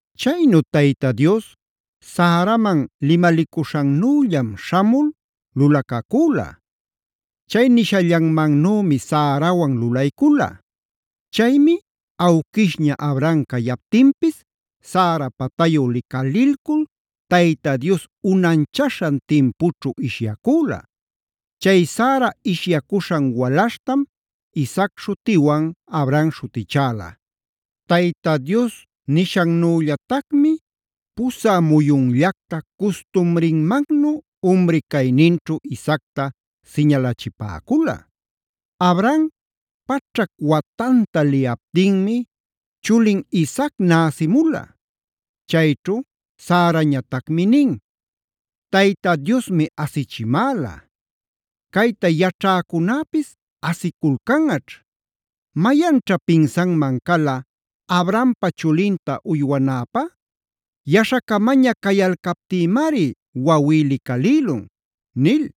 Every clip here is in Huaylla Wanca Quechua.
Chaynu Tayta Dios Saraman limalicuśhannüllam śhamul lulacacüla. Chay nishallanmannümi Sarawan lulaycula. Chaymi awquishña Abraham cayaptinpisa Sara patayu licalilcul Tayta Dios unanchaśhan timpućhu ishyacüla. Chay Sara ishyacuśhan walaśhtam Isaac śhutiwan Abraham śhutichäla. Tayta Dios nishannüllatacmi pusä muyunllactab custumrinmannu umri cayninćhu Isaacta siñalachipäcula. Abraham paćhac watanta liyaptinmi chulin Isaac näsïmula. Chayćhu Sarañatacmi nin: Tayta Diosmi asichimäla. Cayta yaćhäcunäpis asiculcanꞌaćh. ¿Mayanćha pinsanman cala Abrahampa chulinta uywanäpä? Yaśhacamaña cayalcaptïmari wawí licalïlun” nil.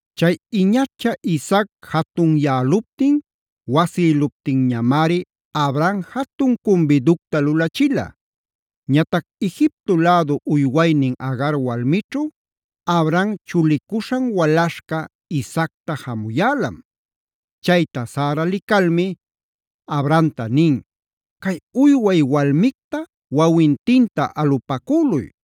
Chay iñacha Isaac jatunyäluptin wasïluptinñamari, Abraham jatun cumbiducta lulachila. Ñatac Egipto lädu uywaynin Agar walmićhu Abraham chulicuśhan walaśhca Isaacta jamuyälam. Chayta Sara licalmi, Abrahamta nin: “Cay uyway walmicta wawintinta alupacüluy.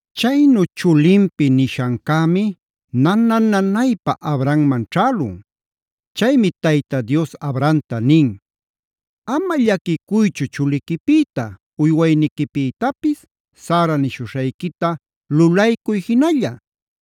Chaynu chulinpi nishancämi nana-nanaypa Abrahamman ćhälun. Chaymi Tayta Dios Abrahamta nin: “Ama llaquicuychu chuliquipïta, uywayniquipïtapis, Sara nishuśhayquita lulaycuy jinalla.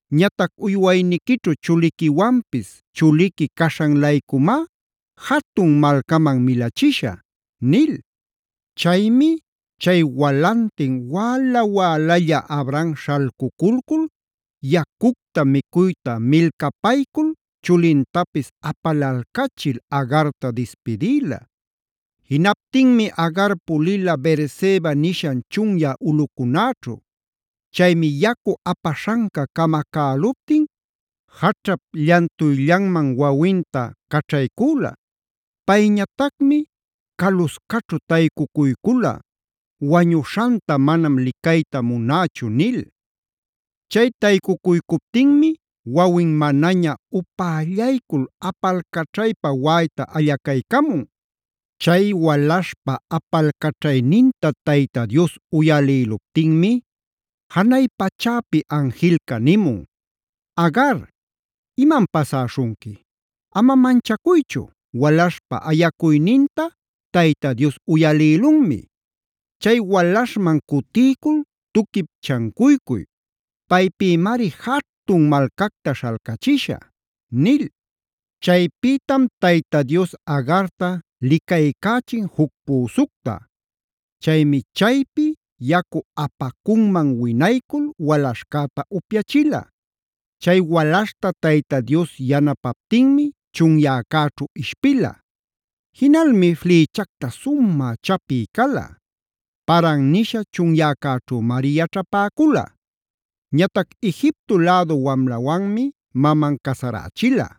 Ñatac uywayniquićhu chuliquiwanpis chuliqui caśhan-laycumá jatun malcaman milachishä” nil. Chaymi chay walantin wäla-wälalla Abraham śhalcuculcul yacucta micuyta milcapaycul, chulintapis apalalcachil Agarta dispidïla. Jinaptinmi Agar pulila Beerseba nishan chunyä ulꞌucunäćhu. Chaymi yacu apaśhanca camacäluptin jaćhap llantuyllanman wawinta caćhaycüla. Payñatacmi caluscaćhu taycucuycula “wañuśhanta manam licayta munächu” nil. Chay taycucuycuptinmi wawin manaña upällaycul apalcaćhaypa waꞌayta allacaycamun. Chay walaśhpa apalcaćhayninta Tayta Dios uyalïluptinmi janay pachäpi anjilca nimun: “Agar, ¿imam pasäśhunqui? Ama manchacuychu, walaśhpa ayacuyninta Tayta Dios uyalïlunmi. Chay walaśhman cutiycul, tuquip chancuycuy. Paypïmari jatun malcacta śhalcachishä” nil. Chaypïtam Tayta Dios Agarta licaycächin juc püsucta. Chaymi chaypi yacu apacunmane winaycul walaśhcäta upyachila. Chay walaśhta Tayta Dios yanapaptinmi chunyäcäćhu ishpila. Jinalmi flïchacta sumä chapï cala. Paran nisha chunyäcäćhümari yaćhapäcula. Ñatac Egipto lädu wamlawanmi maman casarächila.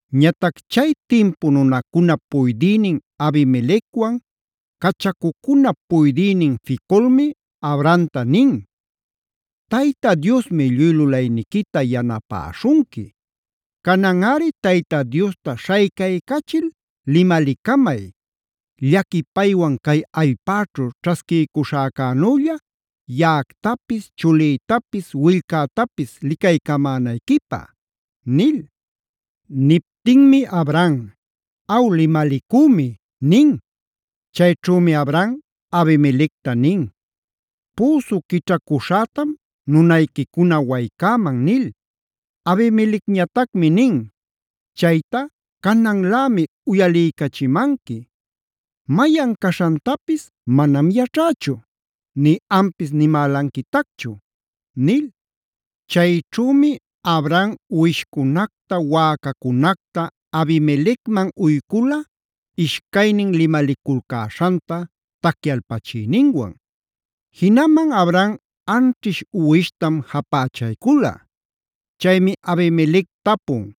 Ñatac chay timpu nunancunap puydïnin Abimelecwanf cachacucunap puydïnin Ficolmi Abrahamta nin: Tayta Diosmi lluy lulayniquita yanapäśhunqui. Cananꞌari Tayta Diosta śhaycaycachil limalicamay: llaquipaywan cay allpäćhu ćhasquiycuśhäcänülla yaꞌactapis, chulïtapis, willcätapis licaycamänayquipä” nil. Niptinmi Abraham: “Aw limalicümi” nin. Chayćhümi Abraham Abimelecta nin: “Püsu quićhacuśhätam nunayquicuna waycäman” nil. Abimelecñatacmi nin: “Chayta cananlämi uyaliycachimanqui; mayan caśhantapis manam yaćhächu, nï ampis nimälanquitacchu” nil. Chayćhümi Abraham uwishcunacta, waꞌacacunacta Abimelecman uycula ishcaynin limaliculcäśhanta tacyalpachïninwan. Jinaman Abraham anćhish uwishtam japächaycula. Chaymi Abimelec tapun: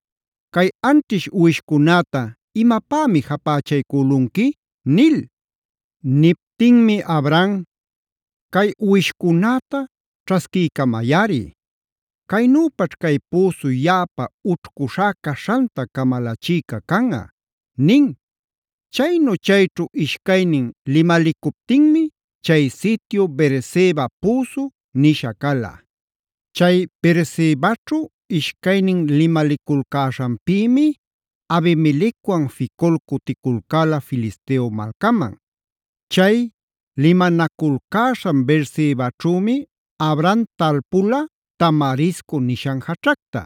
“¿Cay anćhish uwishcunäta imapämi japächaycülunqui?” nil. Niptinmi Abraham: “Cay uwishcunäta ćhasquiycamayꞌari. Caynüpaćh cay püsu yaꞌapa ućhcuśhá caśhanta camalachïca canꞌa” nin. Chaynu chayćhu ishcaynin limalicuptinmi chay sityu “Beerseba püsu”g nisha cala. Chay Beersebaćhu ishcaynin limaliculcäśhanpïmi Abimelecwan Ficol cuticulcäla Filisteo malcaman. Chay limanaculcäśhan Beersebaćhümi Abraham talpula tamarisco nishan jaćhacta;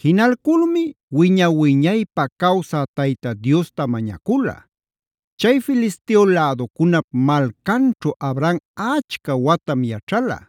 jinalculmi wiña-wiñaypä cawsä Tayta Diosta mañacula. Chay Filisteo läducunap malcanćhu Abraham achca watam yaćhala.